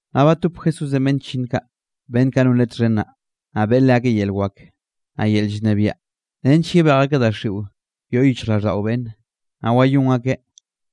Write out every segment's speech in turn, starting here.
Naꞌ batop Jesúsenꞌ beꞌnn chllinn kaꞌ, beꞌnn kaꞌ non Leꞌe txhen naꞌ, naꞌ beꞌe leakeꞌ yel wak, naꞌ yel llnebiaꞌ nench yebej akeꞌ daxiꞌo yoꞌ yichjraꞌlldaꞌo beꞌnne, naꞌ wayón akeꞌ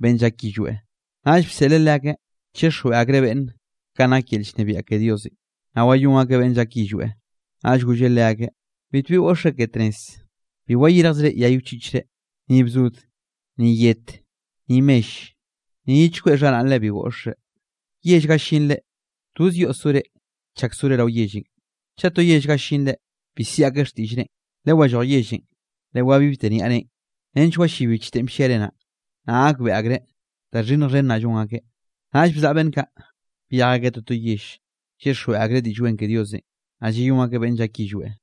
beꞌnn llak yillweꞌ. Naꞌll bseꞌleꞌ leakeꞌ chixjweꞌ akreꞌ beꞌnne kanꞌ nak yel llnebiaꞌ ke Diosenꞌ, naꞌ wayón akeꞌ beꞌnn llak yillweꞌ. Naꞌll golleꞌ leakeꞌ: —Bitbi goꞌxzre ke tnez, bi wayirjzre yay wchiꞌchre, ni bzod, ni yet, ni mell, ni ye chkweꞌ xharaꞌnre bi goꞌxre. Yell ga llinre, toz yoꞌ sore chak sore rao yellenꞌ. Chaꞌ to yell ga llinre bi siꞌi akeꞌ xtiꞌllrenꞌ, lewalloj yellenꞌ, lewabibte niaꞌre nench wallib bichtenꞌ blliare naꞌ, naꞌ gakbeꞌe akreꞌ da xhinnj xhen naꞌ llon akeꞌ. Naꞌll bzaꞌa beꞌnn kaꞌ, byej akeꞌ toto yell, llyixjweꞌ akreꞌ Diꞌll Wen ke Diosenꞌ, naꞌ llayón akeꞌ beꞌnn llak yillweꞌ.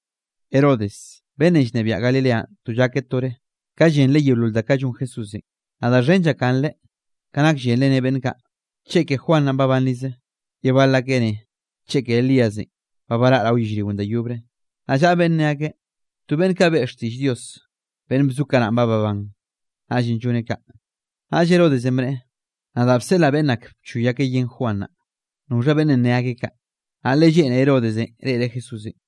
Herodes, beꞌnnenꞌ llnebiaꞌ Galileanꞌ to llakeꞌ tore, ka llenreꞌ yeolol da kaꞌ llon Jesúsenꞌ, naꞌ da xhen llakganreꞌ ka nak llenreꞌ ne beꞌnn kaꞌ: “Cheke Juan naꞌ babanrizeꞌ.” Ye bal akeꞌ ne: “Cheke Elíasenꞌ, ba baraꞌ rao yellrionꞌ da yobre.” Naꞌ llaꞌa beꞌnn ne akeꞌ: “To beꞌnn kaꞌ beꞌe xtiꞌll Dios, beꞌnn bzo kanaꞌn ba babán, naꞌllenꞌ lloneꞌ kaꞌ.” Naꞌll Herodesenꞌ bneꞌe: —Nadaꞌ bseꞌlaꞌ beꞌnn ak bchoy akeꞌ yen Juan naꞌ, ¿noxha beꞌnnenꞌ ne akeꞌ kaꞌ? Naꞌ le lleꞌne Herodesenꞌ reꞌreꞌ Jesúsenꞌ.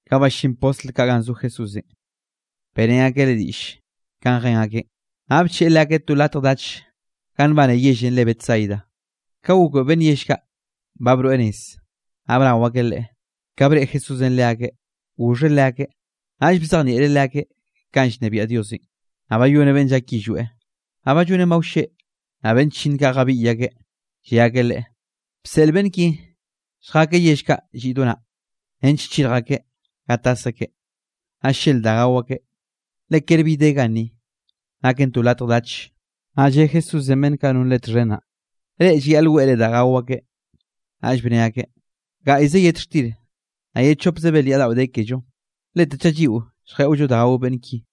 Ka ballín postl kaꞌ ganꞌ zo Jesúsenꞌ, beꞌrén akeꞌ Leꞌe diꞌll kanꞌ jen akeꞌn. Naꞌ bcheꞌe leakeꞌ to latj dach ganꞌ nbane yellenꞌ re Betsaida. Ka gokbeꞌe beꞌnn yell kaꞌ ba broeꞌ nez, naꞌ bnao akeꞌ Leꞌe. Ka breꞌe Jesúsenꞌ leakeꞌ goxheꞌ leakeꞌ, naꞌll bzejnieꞌreꞌ leakeꞌ kanꞌ llnebiaꞌ Diosenꞌ, naꞌ bayoneꞌ beꞌnn llak yillweꞌ. Naꞌ ba llonen ba wlleꞌ, naꞌ beꞌnn chllinn kaꞌ jabiꞌy akeꞌ, lle akeꞌ Leꞌe: —Bseꞌl beꞌnn ki lljakeꞌ yell kaꞌ lliꞌ do naꞌ, nench chirj akeꞌ ga tas akeꞌ, naꞌ llel da gao akeꞌ, le ker bi de ganni, naken to latj dach. Naꞌ lle Jesúsenꞌ beꞌnn kaꞌ non Leꞌe txhen naꞌ: —Reꞌ llayaꞌl weꞌre da gao akeꞌ. Naꞌll bne akeꞌ: —Gaꞌy ze yet xtir, naꞌ ye chopze belyaꞌ daꞌo de kello, lete chaꞌ lliꞌo lljeꞌollo da gao beꞌnn ki.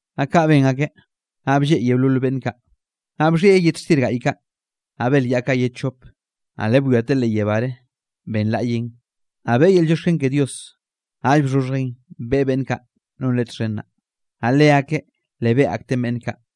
Naꞌ kaꞌ ben akeꞌ, naꞌ blleꞌ yeolol beꞌnn kaꞌ. Naꞌ bxhieꞌ yet xtir gaꞌy kaꞌ, naꞌ belyaꞌ kaꞌ ye chop, naꞌ le bwiateꞌ leꞌ yebáre, benlaꞌyeꞌn, naꞌ beꞌe yel llioxken ke Dios, naꞌll bxhoxhjeꞌn beꞌe beꞌnn kaꞌ non Leꞌen txhen naꞌ, naꞌ leakeꞌn le beꞌe akteꞌn beꞌnn kaꞌ.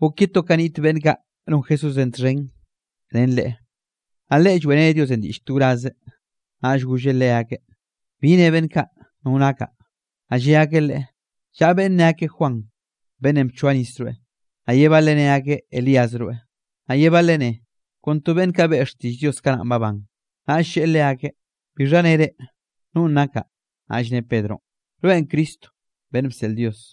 Gok ye to ka niꞌt beꞌnn kaꞌ non Jesúsenꞌ txhen ren Leꞌe, naꞌ Leꞌe lloeꞌreneꞌ Diosenꞌ diꞌlle to wraze. Naꞌll golleꞌ leakeꞌ: —¿Bi ne beꞌnn kaꞌ no nakaꞌ? Naꞌ lle akeꞌ Leꞌe: —Llaꞌa beꞌnn ne akeꞌ Juan beꞌnnenꞌ bchoa nis rweꞌ, naꞌ ye baleꞌ ne akeꞌ Elías rweꞌ, naꞌ ye baleꞌ neꞌe, kon to beꞌnn kaꞌ beꞌe xtiꞌll Dios kanaꞌ babán. Naꞌll lleꞌe leakeꞌ: —¿Bixha ne reꞌ, nonꞌ nakaꞌ? Naꞌll ne Pedronꞌ: —Rweꞌn Cristo beꞌnn bseꞌl Dios.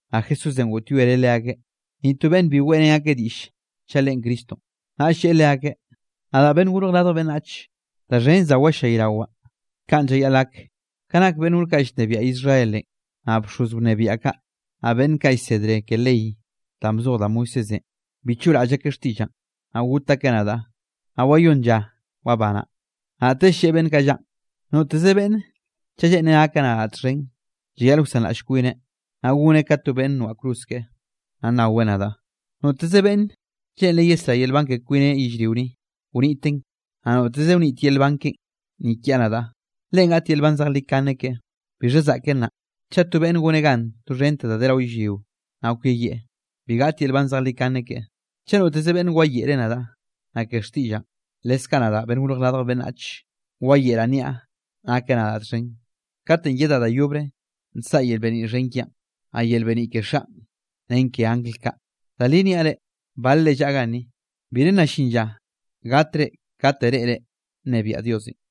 Naꞌ Jesúsenꞌ goꞌtyoereꞌ leakeꞌ, ni to beꞌnn bi weꞌrén akeꞌ diꞌll chaꞌ Leꞌen Cristonꞌ. Naꞌll lleꞌe leakeꞌ: —Nadaꞌ Beꞌnnenꞌ Gorj Radj Beꞌnnach, da xhen za wallayrawaꞌ, kaꞌn llayaꞌl gak. Ka nak beꞌnn gor kaꞌ llnebiaꞌ Israelenꞌ, naꞌ bxoz wnebiaꞌ kaꞌ, naꞌ beꞌnn kaꞌ llsedre ke ley danꞌ bzoj da Moisésenꞌ, bi choꞌraꞌll akeꞌ xtiꞌllaꞌn, naꞌ got akeꞌ nadaꞌ, naꞌ wayónn lla wabanaꞌ. Naꞌtell lleꞌe beꞌnn kaꞌ llaꞌn: —Noteze beꞌnne chaꞌ lleꞌnreꞌ gakeꞌ nadaꞌ txhen, llayaꞌl wsanraꞌll kwineꞌ, naꞌ goneꞌ ka to beꞌnn noaꞌ cruz keꞌe, naꞌ naweꞌ nadaꞌ. Noteze beꞌnn lleꞌnreꞌ yesrá yel nban ke kwineꞌ yellrio ni, wniteꞌn, naꞌ noteze wnit yel nban keꞌen ni kiaꞌ nadaꞌ, leꞌen gaꞌt yel nban zejlikane keꞌe. ¿Bixha zaꞌken naꞌ, chaꞌ to beꞌnne goneꞌ gan doxhente da de rao yellrio, naꞌ kweyieꞌ, bi gaꞌt yel nban zejlikane keꞌe? Chaꞌ noteze beꞌnn wayeꞌreꞌ nadaꞌ, naꞌ ke xtiꞌllaꞌn, leskaꞌ nadaꞌ Beꞌnnenꞌ Gorj Radj Beꞌnnach, wayeꞌraꞌ nniaꞌ nakeꞌ nadaꞌ txhen, katenꞌ yedaꞌ da yobre nsaꞌa yel beniꞌ xhen kiaꞌn, naꞌ yel beniꞌ ke Xaꞌn ren ke angl kaꞌ. Da li niaꞌ reꞌ, balre llaꞌa ganni, bire nna llin lla gatre kate reꞌre nnebiaꞌ Diosenꞌ.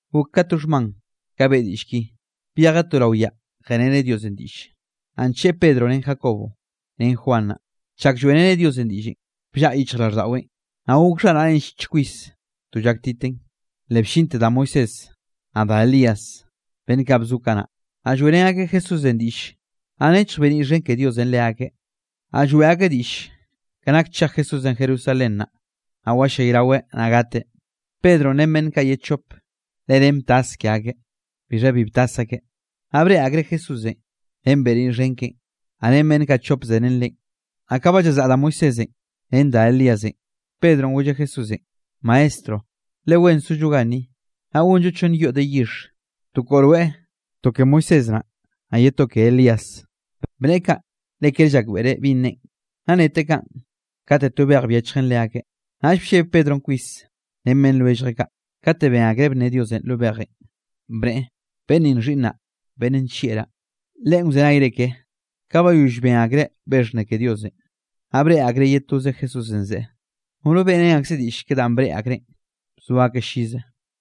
Gok ka to xhman ka beꞌe diꞌll ki, byejeꞌ to rao yaꞌ jeꞌreneꞌ Diosenꞌ diꞌlle, naꞌ ncheꞌe Pedronꞌ ren Jacobo, ren Juan naꞌ. Chak lloeꞌreneꞌ Diosenꞌ diꞌllenꞌ, bllaꞌa yichjraweꞌn, naꞌ gok xharaꞌneꞌn llich kwis, to llaktiten. Le bllinte da Moisés, naꞌ da Elías, beꞌnn kaꞌ bzo kanaꞌ, naꞌ lloeꞌrén akeꞌ Jesúsenꞌ diꞌlle. Naꞌ nechj beniꞌ xhen ke Diosenꞌ leakeꞌ, naꞌ lloeꞌ akeꞌ diꞌll ke nak chej Jesúsenꞌ Jerusalén, naꞌ wallayraweꞌ naꞌ gateꞌ. Pedronꞌ ren beꞌnn kaꞌ ye chop, le nen btas ke akeꞌ; bixha bi btas akeꞌ, naꞌ breꞌe akreꞌ Jesúsenꞌ ren beniꞌ xhen keꞌen, naꞌ ren beꞌnn kaꞌ chop zerén Leꞌen. Naꞌ ka ba llazaꞌ da Moisésenꞌ ren da Elíasenꞌ, Pedronꞌ golleꞌ Jesúsenꞌ: —Maestro, le wen zollo ganni, naꞌ gonllo chonn yoꞌ de yixh, to koꞌo rweꞌ, to Moisés naꞌ, naꞌ ye to Elías. Bneꞌe kaꞌ le ker llakbeꞌreꞌ binꞌ neꞌen. Naꞌ neteꞌ kaꞌn, kate to bej byechjen leakeꞌ, naꞌll blleb Pedronꞌ kwis ren beꞌnn lwelljeꞌ kaꞌ. Kate ben akreꞌ bnne Diosenꞌ lo bejenꞌ, bneꞌe: —Beꞌnn ninꞌ Xhiꞌnnaꞌ, beꞌnn nllieꞌraꞌ; Leꞌen wzenayre keꞌe. Ka bayoll ben akreꞌ be xhnne ke Diosenꞌ, naꞌ breꞌe akreꞌ ye toze Jesúsenꞌ zeꞌe. Nono beꞌrén akzeꞌ diꞌll ke danꞌ breꞌe akreꞌn, bzo akeꞌ llize.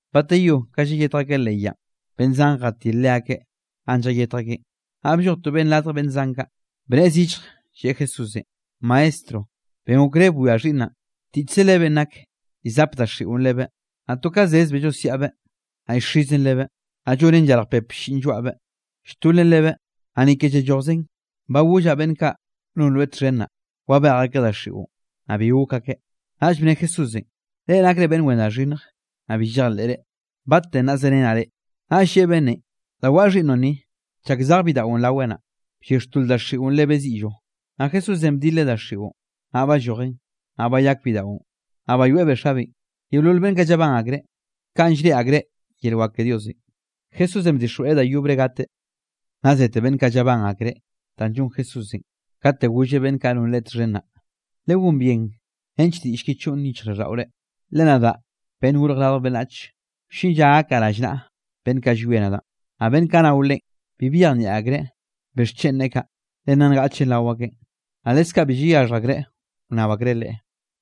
Bateyó ka llayetj akeꞌ leꞌ yaꞌn, beꞌnn zan jatil leakeꞌ ganꞌ llayetj akeꞌn. Naꞌ blloj to beꞌnn radj beꞌnn zan kaꞌ, bnneꞌe zillj lleꞌe Jesúsenꞌ: —Maestro, ben okré bwia xhiꞌnnaꞌn, tiꞌchze lebeꞌn nak. Llzap daxiꞌon lebeꞌ, naꞌ to ka zezbeꞌ llosiaꞌbeꞌ, naꞌ llxizen lebeꞌ, naꞌ llonen llarj pep blliꞌn lloaꞌbeꞌ; lltolen lebeꞌ, naꞌ ni ke llallojzen. Ba gollaꞌ beꞌnn kaꞌ non rweꞌ txhen naꞌ, wabej akeꞌ daxiꞌon, naꞌ bi gok akeꞌ. Naꞌll bne Jesúsenꞌ: —Reꞌ nakre beꞌnn wen da xhinnj, naꞌ bi llejleꞌre, ¿battenꞌ naꞌ zerenaꞌ reꞌ? Naꞌll lleꞌe beꞌnnenꞌ: —Da waꞌa xhiꞌnnoꞌn ni. Chak zej bidaꞌon raweꞌ naꞌn, bllixtol daxiꞌon lebeꞌ ziꞌllo, naꞌ Jesúsenꞌ bdileꞌ daxiꞌon, naꞌ ballojen, naꞌ bayak bidaꞌon, naꞌ bayoeꞌbeꞌ xabeꞌn. Yeolol beꞌnn kaꞌ llabán akreꞌ, kanꞌ llreꞌe akreꞌ yel wak ke Diosenꞌ. Nna zete beꞌnn kaꞌ, llabán akreꞌ danꞌ llon Jesúsenꞌ, kate golleꞌ beꞌnn kaꞌ non Leꞌe txhen naꞌ: —Legón bien nench diꞌll ki choꞌn yichjraꞌlldaꞌore, le nadaꞌ, Beꞌnnenꞌ Gorj Radj Beꞌnnach, wllin lla gakaꞌ rallnaꞌa beꞌnn kaꞌ llwie nadaꞌn. Naꞌ beꞌnn kaꞌ nao Leꞌen, bi byejnieꞌ akreꞌ bixchen neꞌe kaꞌ, le nna ngaꞌchen rao akeꞌn, naꞌ leskaꞌ bi llayaxhj akreꞌ wnnab akreꞌ Leꞌe.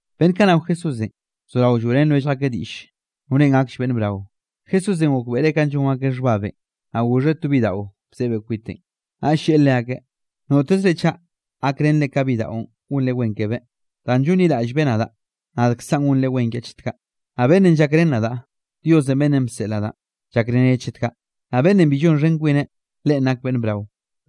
Beꞌnn kaꞌ nao Jesúsenꞌ bzorao lloeꞌrén lwellj akeꞌ diꞌll, norenꞌ gakll beꞌnn brao. Jesúsenꞌ gokbeꞌreꞌ kanꞌ llon akeꞌ xhbabenꞌ, naꞌ goxheꞌ to bidaꞌo bzebeꞌ kwiteꞌn. Naꞌll lleꞌe leakeꞌ: —Notezre chaꞌ gakrenre ka bidaꞌon gonre wen kebeꞌ, danꞌ llonliraꞌllbeꞌ nadaꞌ, nadkzaꞌn gonre wen kiaꞌ chet kaꞌ. Naꞌ beꞌnnenꞌ llakren nadaꞌ, Diosenꞌ, beꞌnnenꞌ bseꞌl nadaꞌn, llakreneꞌ chet kaꞌ. Naꞌ beꞌnnenꞌ bi llonxhen kwineꞌ, leꞌen nak beꞌnn brao.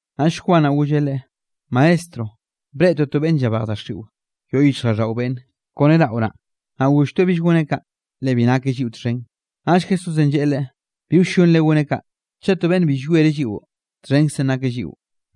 Naꞌll Juan naꞌ golleꞌ Leꞌe: —Maestro, breꞌtoꞌ to beꞌnn llabejeꞌ daxiꞌo yoꞌ yichjraꞌlldaꞌo beꞌnne kone raꞌo naꞌ. Naꞌ golltoeꞌ bill goneꞌ kaꞌ, le bi nakeꞌ lliꞌo txhen. Naꞌll Jesúsenꞌ lleꞌe leꞌe: —Bi wllonre goneꞌ kaꞌ. Chaꞌ to beꞌnne bi llwiereꞌ lliꞌo, txhenkzenꞌ nakeꞌ lliꞌo.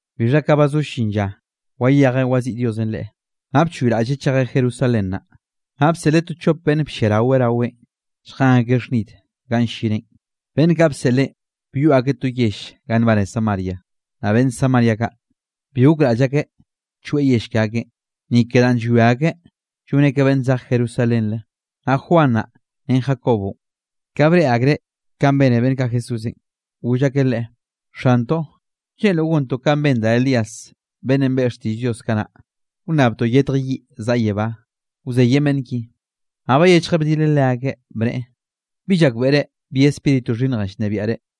Bixha ka ba zo llin lla, wayejeꞌ waziꞌi Diosenꞌ Leꞌe, naꞌ bchoyraꞌlleꞌ chejeꞌ Jerusalén naꞌ. Naꞌ bseꞌleꞌ to chop beꞌnn blliarao raweꞌn, lljen akeꞌ xhnid ganꞌ llineꞌn. Beꞌnn kaꞌ bseꞌleꞌn, byoꞌ akeꞌ to yell ga nbane Samaria. Naꞌ beꞌnn Samaria kaꞌ, bi gokraꞌll akeꞌ choeꞌ yell ke akeꞌn, ni ke danꞌ llwia akeꞌ lloneꞌ ka beꞌnn zej Jerusalénre. Naꞌ Juan naꞌ, ren Jacobonꞌ, ka breꞌe akreꞌ kanꞌ bene beꞌnn kaꞌ Jesúsenꞌ, goll akeꞌ Leꞌe: —Xantoꞌ, ¿Lleꞌnroꞌ, gontoꞌ kanꞌ ben da Elías beꞌnnenꞌ beꞌe xtiꞌll Dios kanaꞌ, wnnabtoꞌ yetj yiꞌ zaꞌa yebá, wzeyen beꞌnn ki? Naꞌ bayechjeꞌ bdileꞌ leakeꞌ, bneꞌe: —Bi llakbeꞌre bi Spíritu xhinnje llnebiaꞌ reꞌ.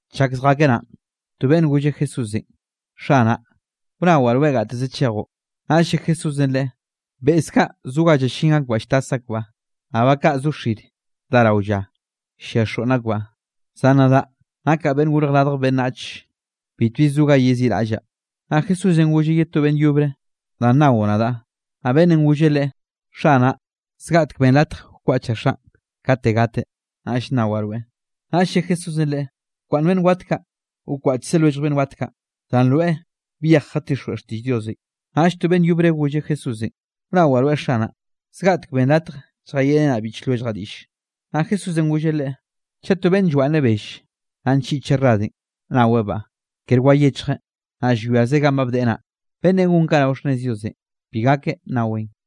Chak zjakeꞌ naꞌn, to beꞌnn golleꞌ Jesúsenꞌ: —Xanaꞌ, wnawaꞌ rweꞌ gateze chejoꞌ. Naꞌll lle Jesúsenꞌ leꞌe: —Beꞌz kaꞌ zo ga llallín akbaꞌ lltas akbaꞌ, naꞌ ba kaꞌ zo xir dá rao lla, llia xoꞌnn akbaꞌ, zan nadaꞌ, nakaꞌ Beꞌnnenꞌ Gorj Radj Beꞌnnach, bitbi zo ga yeziꞌraꞌllaꞌ. Naꞌ Jesúsenꞌ golleꞌ ye to beꞌnn yobre: —Da nnao nadaꞌ. Naꞌ beꞌnnenꞌ golleꞌ Leꞌe: —Xanaꞌ, zgaꞌtek benn latj wkwaꞌchaꞌ xaꞌn kate gateꞌ, naꞌll nnawaꞌ rweꞌ. Naꞌll lle Jesúsenꞌ leꞌe: —Bkwaꞌnn beꞌnn wat kaꞌ, wkwaꞌchze lwellj beꞌnn wat kaꞌ, zan rweꞌ byej jatixjweꞌ xtiꞌll Diosenꞌ. Naꞌll to beꞌnn yobre golleꞌ Jesúsenꞌ: —Wnawaꞌ rweꞌ Xanaꞌ, zgaꞌtek ben latj lljayeꞌrenaꞌ biꞌch lwelljaꞌ diꞌlle. Naꞌ Jesúsenꞌ golleꞌ leꞌe: —Chaꞌ to beꞌnn llwaꞌnneꞌ belle, naꞌ nchiꞌcheꞌ radenꞌ nawebaꞌ; kere wayechjeꞌ, naꞌ llwiazeꞌ ganꞌ ba bdeꞌe naꞌ, beꞌnnenꞌ gon kaꞌ rao xhnnez Diosenꞌ bi gakeꞌ nnaweꞌn.